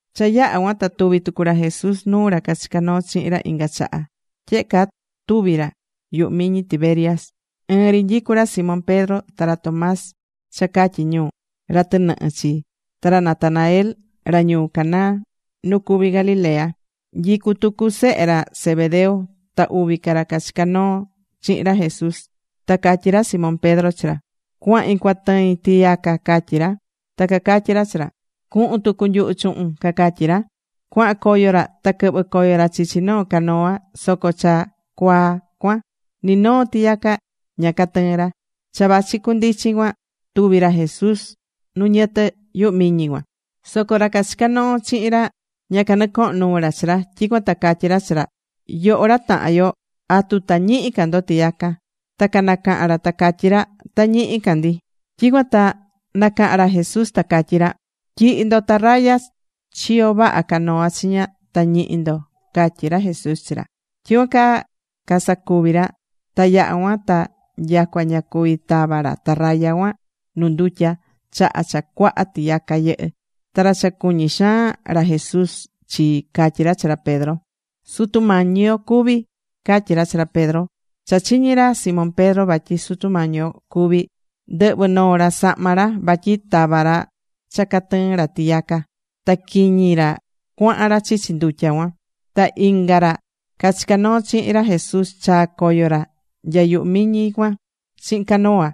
Cha yaha̱ cuan ta tuvi̱ tucu ra Jesús nuu ra cachica̱ noo chihin ra inga chaha. Tyehe caa tuvi̱ ra yuhu miñi Tiberias. Ɨɨn ri nyicú ra Simón Pedro ta ra Tomás cha catyi ñu: “ra tɨnɨhɨ” chi, ta ra Natanael, ra ñuu Caná nu cuví Galilea. Nyicú tucu sehe ra Zebedeo ta uvi ca ra cachica̱ noo chihin ra Jesús. Ta catyí ra Simón Pedro chi ra: ―Cuahin cuatɨin tiyaca ―catyí ra. Ta cacatyí ra chi ra: ―Cuhun tucu nyuhu chuhun ―cacatyí ra. Cuahan coyo ra ta quɨhvɨ̱ coyo ra chichi noo canoa, soco cha cuaa cuan ni noo tiyaca ña catɨɨ̱n ra. Cha vachi cundichin cuan tuvi̱ ra Jesús nu ñɨtɨ yuhu miñi cuan. Soco ra cachica̱ noo chihin ra, ña canɨcohón nuu ra chi ra. Tyicuan ta catyí ra chi ra: ―Yoho ra tahan yo, ¿atu ta ñihi ca ndo tiyaca? Ta canacaha̱n ra ta catyí ra: ―Ta ñihi ca ndi. Tyicuan ta nacaha̱n ra Jesús ta catyí ra: ―Tyi̱hi ndo tarraya chiyo vaha canoa chiña, ta ñihi ndo ―catyí ra Jesús chi ra. Tyicuan caa casacuvi̱ ra, ta yaha cuan ta nyacua ña cuvi̱ tava ra tarraya cuan nu ndutya chaha cha cuaha tiyaca yɨhɨ́. Ta ra cha cuñí xaan ra Jesús chii catyí ra chi ra Pedro: ―¡Sutu Mañi yo cuví! ―catyí ra chi ra Pedro. Cha chiñi̱ ra Simón Pedro vatyi Sutu Mañi yo cuví, ndɨhvɨ̱ noo ra sahma ra, vatyi tava̱ ra cha cuatɨɨn ra tiyaca, ta quiñi ra cuahan ra chichi ndutya cuan. Ta inga ra cachica̱ noo chihin ra Jesús chaa̱ coyo ra nya yuhu miñi cuan chihin canoa,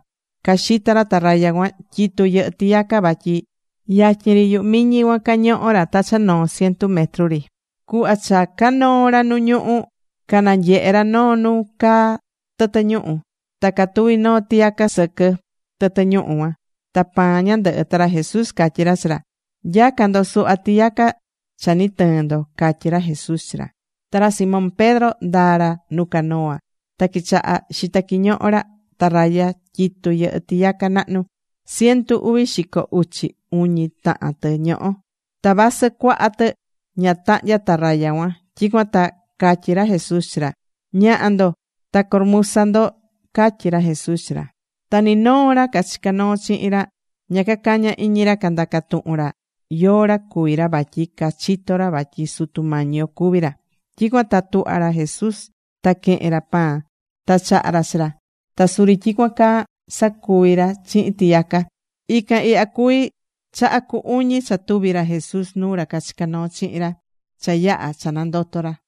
caxitá ra tarraya cuan tyitú yɨhɨ́ tiyaca, vatyi yatyin ri yuhu miñi cuan cañohó ra ta cha noo cientu metru ri. Cuhva cha canoó ra nu ñuhú, cananyehe̱ ra noo nu caá tɨtɨ ñuhu̱. Ta catuví noo tiyaca sɨquɨ tɨtɨ ñuhu̱ cuan, ta pan ñandɨhɨ. Ta ra Jesús catyí ra chi ra: ―Nya̱ca ndo suhva tiyaca cha ni tɨɨ̱n ndo ―catyí ra Jesús chi ra. Ta ra Simón Pedro ndaa̱ ra nu canoa ta quichaha̱ xita quiñoho ra tarraya tyitú yɨhɨ́ tiyaca nahnu. Cientu uvi xico uchi uñi tahan tɨ ñohó. Ta vasɨ cuaha tɨ, ña tahnya̱ tarraya cuan. Tyicuan ta catyí ra Jesús chi ra: ―Ña̱ha ndo ta curumusa ndo ―catyí ra Jesús chi ra. Ta ni noo ra cachica̱ noo chihin ra ña cacaña̱ iñi ra candaca tuhun ra yóó ra cuví ra vatyi cachitó ra vatyi Sutu Mañi yo cuví ra. Tyicuan ta tuhva̱ ra Jesús ta quehe̱n ra pan, ta chaha̱ ra chi ra. Ta suri tyicuan caa sacuvi̱ ra chihin tiyaca. Ican ihya cuví chaha cu uñi cha tuvi̱ ra Jesús nuu ra cachica̱ noo chihin ra cha yaha̱ cha nandoto̱ ra.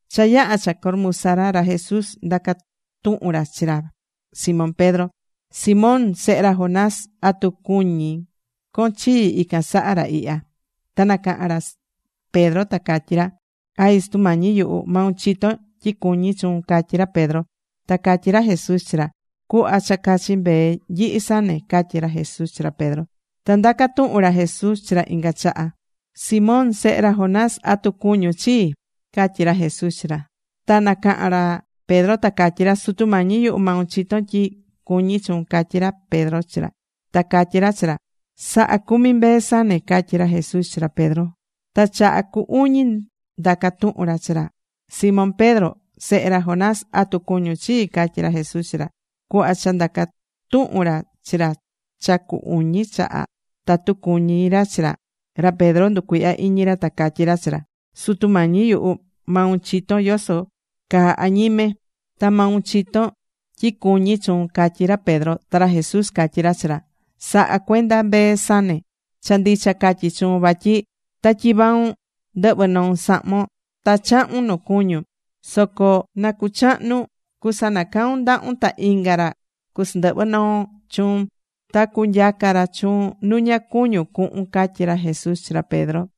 Cha yaha̱ cha curumusa ra Jesús, ndaca̱ tuhun ra chi ra Simón Pedro: ―Simón, sehe ra Jonás, ¿atu cuñí con chii ican saha ra ihya? Ta nacaha̱n ra Pedro ta catyí ra: ―Ay, Sutu Mañi yuhu, maun chitón tyi cuñí chuun ―catyí ra Pedro. Ta catyí ra Jesús chi ra: ―Cu̱hva cha cachi mbee nyihi sane ―catyí ra Jesús chi ra Pedro. Ta ndaca̱ tuhun ra Jesús chi ra inga chaha: ―Simón sehe ra Jonás, ¿atu cuñún chii? ―catyí ra Jesús chi ra. Ta nacaha̱n ra Pedro ta catyí ra: ―Sutu Mañi yuhu, maun chitón tyi cuñí chuun ―catyí ra Pedro chi ra. Ta catyí ra chi ra: ―Sa̱ha cumi mbee sane ―catyí ra Jesús chi ra Pedro. Ta chaha cu uñi ndaca̱ tuhun ra chi ra: ―Simón Pedro, sehe ra Jonás, ¿atu cuñun chii? ―catyí ra Jesús chi ra. Cuhva cha ndaca̱ tuhun ra chi ra cha cu uñi chaha tatu cuñí ra chi ra, ra Pedro nducuihya iñi ra, ta catyí ra chi ra: ―Sutu Mañi yuhu, maun chitón yoso caa añime ta maun chitón tyi cuñí chuun ―catyí ra Pedro. Ta ra Jesús catyí ra chi ra: ―Sa̱ha cuenda mbee sane. Cha ndicha catyí chuun vatyi ta tyivaun ndɨhvɨ̱ noun sahmon ta chahu̱n nu cuñún. Soco na cuchahnun, cusanacaun ndahun ta inga ra cusandɨhvɨ noo chuun. Ta cunyaca ra chuun nu ña cuñún cuhun ―catyí ra Jesús chi ra Pedro.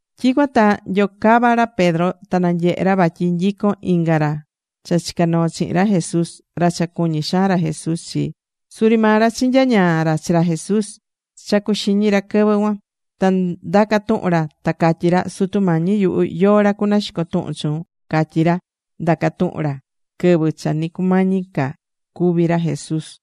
Tyicuan ta nyocava̱ ra Pedro ta nanyehe̱ ra vatyi nyicón inga ra cha chica̱ noo chihin ra Jesús, ra cha cuñí xaan ra Jesús chi. Suri maa ra chinyañaa̱ ra chi ra Jesús cha cuxiñi ra quɨvɨ cuan. Ta ndaca̱ tuhun ra ta catyí ra: “Sutu Mañi yuhu, ¿yóó ra cunaxico tuhun chuun?” catyi̱ ra, ndaca̱ tuhun ra quɨvɨ cha ni cumañi cúvi ra Jesús.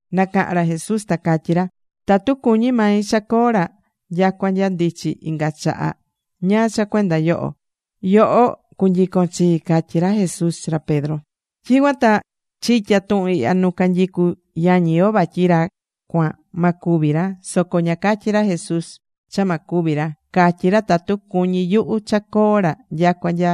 Nacaha̱n ra Jesús ta catyí ra: ―Tatu cuñí mai cha coo ra nyacua nya ndichi inga chaha, ¿ñáá cha cuenda yoho? Yoho cu̱nyicon chii ―catyí ra Jesús chi ra Pedro. Tyicuan ta chitya̱ tuhun ihya nu canyicú yañi yo vatyi ra cuan, ma cúvi ra. Soco ña catyi̱ ra Jesús cha ma cúvi ra. Catyí ra: “Tatu cuñí yuhu cha coo ra nyacua nya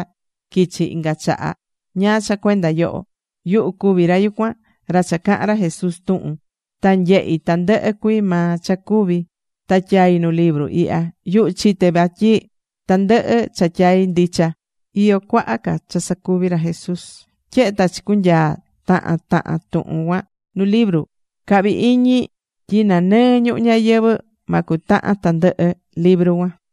quichi inga chaha, ¿ñáá cha cuenda yoho?” Yuhu cuví ra yucuan, ra cha cahán ra Jesús tuhun. Ta nyehi̱ tandɨhɨ cuii maa cha cuvi̱ ta tyai̱ nu libru ihya. Yuhu chite vatyi tandɨhɨ cha tyai̱, ndicha. Iyó cuaha ca cha sacuvi̱ ra Jesús. Tyehe ta chicunyaa̱ tahan tahan tuhun cuan nu libru, cahví iñi tyi nanɨɨ ñuhu ñayɨvɨ̱ ma cutahan tandɨhɨ libru cuan.